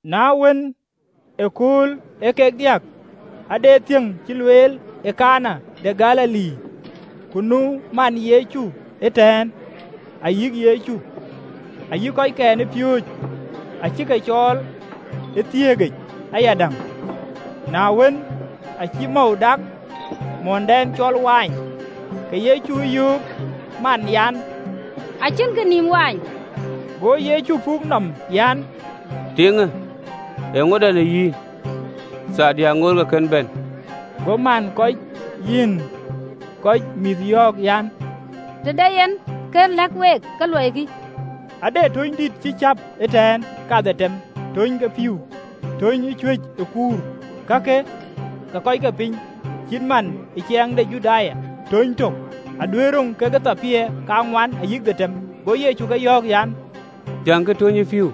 Na wën, ëkööl ee kek diäk ade thiëŋ cï lueel ë Kana de Galili, ku nu man Yecu ëtɛ̈ɛ̈n: ayï Yecu ayï kɔckɛn ë piööcë acï ke cɔɔl ë thiëëkic ayadäŋ. Na wën, aacï mɔ̈u dak, mɔ̈ndɛn ë cïk looi, ke Yecu ë yöök ë man en an, “Acïnkï nïïm mɔ̈u.” Go Yecu puk nɔm an, “Tiiŋë eeŋöda në yïn? Thaardï aŋoot ke kën bɛ̈n.” Go man kɔc yïn kɔc mïïth yɔ̈ɔ̈k an, “Të de yen kë lëk week, ke luɔikï.” Ade töny dït cï cäp ëtɛ̈ɛ̈n kadhetem, töny ke pïïu, töny ë cuëc ë kuur, kak ee kɔc ke piny, cït man ë ciɛɛŋ de Judai, töny tök aduëër yic dɛk jeluun kathiërrou ayï thiërdiäk. Go Yecu ke yɔ̈ɔ̈k an, “Thiäŋkï töny ë pïïu.”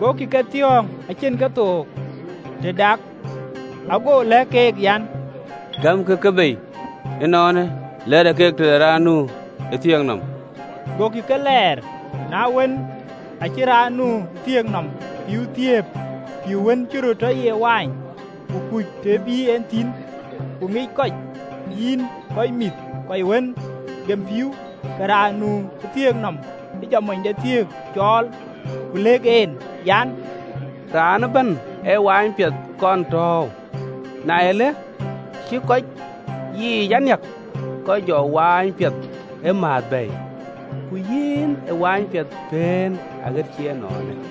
Gokï ke thiɔ̈ɔ̈ŋ acïn kethook të dak. Ago lɛ̈k keek an, “Gɛ̈mkï ke bei ënɔɔnë, lɛɛrkï ke tëde raan nu ë thiëëk nɔm.” Gokï ke lɛɛr. Na wën, acï raan nu ë thiëëk nɔm pïïu thiëëp, pïïu wën cï röt tɔ ye mɔ̈u, ku kuc të bï en thïn (ku ŋic kɔc yïn kɔc mïïth kɔc wën gem pïïu), ke raan nu ë thiëëk nɔm jɔ monythiëk cɔɔl. Ku lëk en an, “Raan ëbɛ̈n ee mɔ̈n piɛth kɔn tääu, na ëlë, të cï kɔc yiic a niäk, ke jɔ mɔ̈n piɛth ëmääth bɛ̈ɛ̈i: ku yïn ë mɔ̈n piɛth pëën aɣet cï ënɔɔnë.”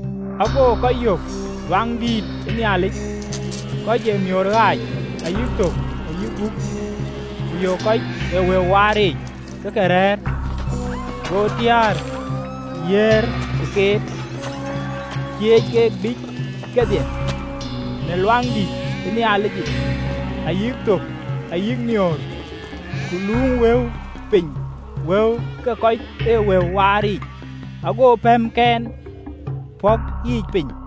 Ago kɔc yök ë Luaŋdïtic, kɔc ee miöör ɣaac ayï thök ayï ajiël ke guuk, ku yök kɔc ee wëu waar yiic ke ke rɛ̈ɛ̈r. Go tiäär yiëër ë këër, ku cieec ke biic kedhie në Luaŋdïtic, ayï thök, ayï miöör, ku luuŋ wëu piny wëu ke kɔc ee wëu waar yiic, ago pɛɛmken pɔ̈k yiic piny,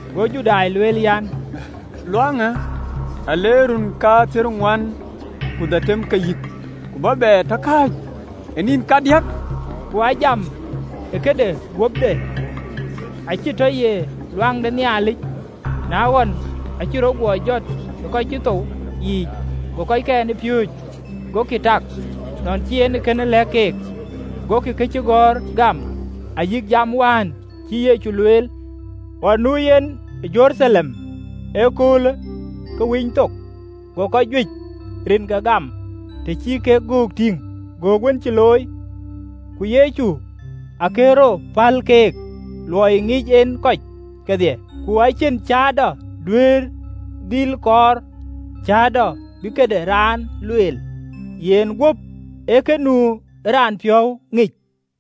Go Judai lueel an, “Luaŋ de Nhialicë aa leer run kathiërŋuan ku dhetem ke yïk, ku bä bɛ tɔ kääc ë nïn kadiäk!” Ku aa jam në këde guöpde, acï tɔ ye luaŋ de Nhialic. Na ɣɔn acï rɔt guɔ jɔt ë kɔc cï thou yiic, go kɔckɛn ë piööcë agokï tak nɔn cï en kënë lɛ̈k keek, gokï këcïgɔ̈ɔ̈r gam, ayï jam wään cïï Yecu lueel. Ɣɔn nu yen ë Jeruthalem ë akööl ke Winythok, go kɔc juëc rinke gam, të cï kek göök tïŋ göök wën cï looi. Ku Yecu akën rɔt päl keek, luɔi ŋic en kɔc kedhie, ku acïn cäätɔ duëër dhil kɔɔr cäätɔ bï këde raan lueel, yen guöp ee kë nu ë raan piɔ̈u ŋic.